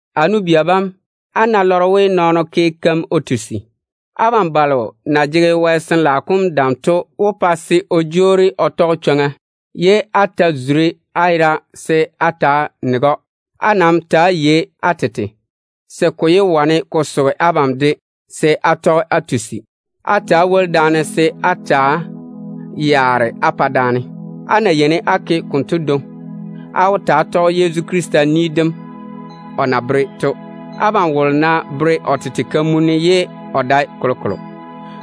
A nu-bia bam, á ná lɔre we nɔɔno ke keim o tusi, abam balo na jege Wɛ Sin-laao kom dam to wó pa se o jwoori o tɔge chwoŋa, ye á ta zuri á yera se á ta‑á nege‑o. Á nam ta‑á yei á tete, se ko yé wane ko soge abam se á de tɔge á tusi. Ta‑á woli-na daane se á ta‑á yaara á pa daane. Á ná yeini á ke konto dwoŋi, á wó ta‑á tɔge Yezu Krista ni dem o na bere to. Abam wolo ná bere o tete kamunni ye o dae kolokolo,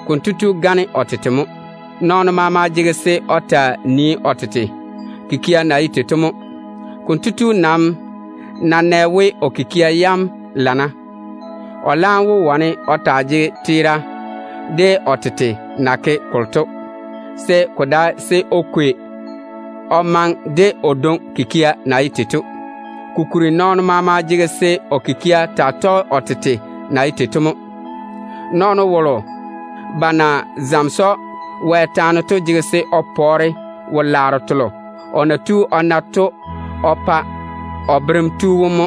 konto tu gane o tete mo. Nɔɔno maama jege se o taa nii o tete kikia na ye tei to mo. Konto tu nam ná nɛ we o kikia yam lana, o laam wó wane o taa jege teera de o tete na ke kolo to, ko dae se o kwei o maŋe de o dwoŋi kikia na ye tei to. Kokuri nɔɔno maama jege se o kikia taa tɔge o tete na ye tei to mo. Nɔɔno wolo ba na zamese‑o Wɛ taane to jege se o pɔɔre wo-laaro telo o na tu o na to o pa o berem tu wom mo.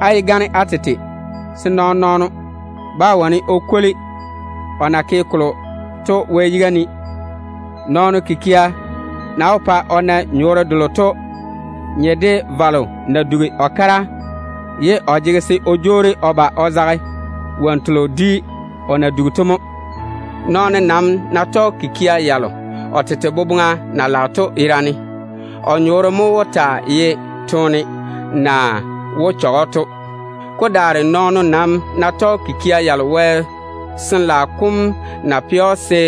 Á yé gane á tete, se nɔɔn-nɔɔno bá wane o kwoli o na ke kolo to Wɛ yiga ne. Nɔɔno kikia na wó pa o na nyɔɔre delo to nye de valo na dugi o kara, ye o jege se o jwoori o ba o zage wonnu telo dwi o na dugi to mo. Nɔɔno nam ná tɔge kikia yalo o tete boboŋa na lage to yerane, o nyɔɔre mo wó taa ye toone na wó chɔge‑o to. Ko daare nɔɔno nam ná tɔge kikia yalo Wɛ Sin-laao kom na pɛ‑o se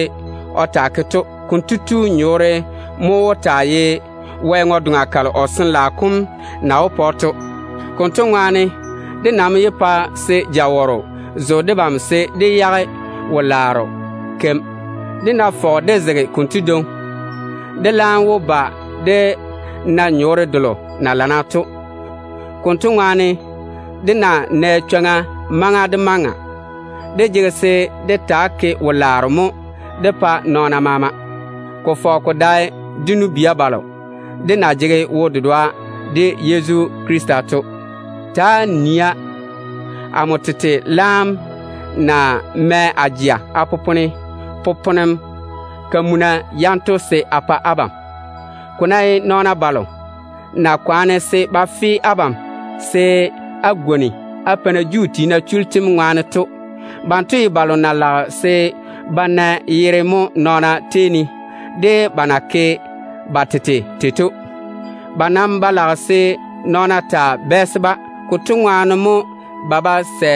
o taa ke to, konto tu nyɔɔre mo wó taa ye Wɛ ŋwe-doŋa kalo o Sin-laao kom na wó pa‑o to. Konto ŋwaane, dé nam yé pa se jawɔrɔ zo debam se dé yage wo-laaro keim. Dé ná fɔge dé zege konto dwoŋi, dé laam wó ba dé na nyɔɔre delo na lana to. Konto ŋwaane, dé ná nɛ chwoŋa maŋa de maŋa, dé jege se dé taa ke wo-laaro mo dé pa nɔɔna maama, ko fɔge ko dae dé nu-bia balo de na jege wo-dedoa de Yezu Krista to. Ta‑á nia, amo tete laam na mɛ a jeŋa a popone botare-bi-kamuna yanto se a pa abam. Ko ná ye nɔɔna balo na kwaane se ba fe abam se á gwoni á peina Juu tiina chullu tem ŋwaane to, banto ye balo na lage se ba na yere mo nɔɔna tei ne, de ba na ke ba tete tei to. Ba nam ba lage se nɔɔna taa bɛɛse-ba. Konto ŋwaane mo ba bá sɛ se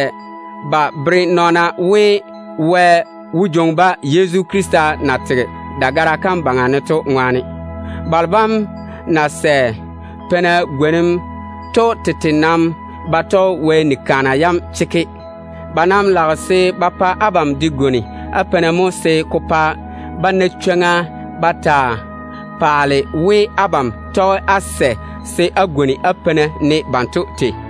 ba bere nɔɔna we, Wɛ wó jwoŋi-ba Yezu Krista na tege dagara kam yuu ne to ŋwaane. Balo bam nam na sɛ peina gwonim to tete nam ba tɔge Wɛ nia yam chekke. Ba nam lage se ba pa abam de gwoni á peina mo se ko pa ba na chwoŋa ba taa paale we, abam tɔge á sɛ se á gwoni á peina ne banto tei.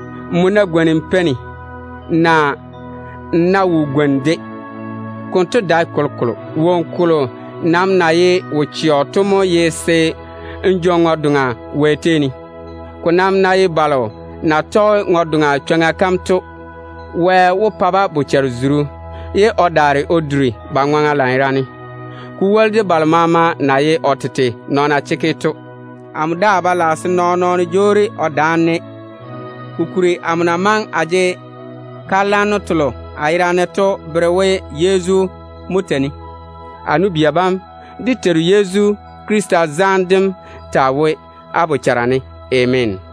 Nmo ná gwoni n peini, naa n ná wo gwoni-de, konto dae kolokolo. Woŋo kolo nam na ye wo-chɛɔ to mo ye se n jwoŋi ŋwe-doŋa Wɛ tei ne. Ko nam ná ye balo na tɔge ŋwe-doŋa chwoŋa kam to, Wɛ wó pa ba na bochare-zuru, ye o daare o duri ba ŋwaŋa lanyerane, ko woli de balo maama na ye o tete nɔɔna chekke to. Amo daa ba lage se nɔɔn-nɔɔno jwoori o daane-ne, kokuri amo na maŋe a jege kalwanno telo a yera ne to bere we Yezu mo tei-ne. A nu-bia bam, dé Teiru Yezu Krista zaane dem taa wo á bochara ne. Ameena.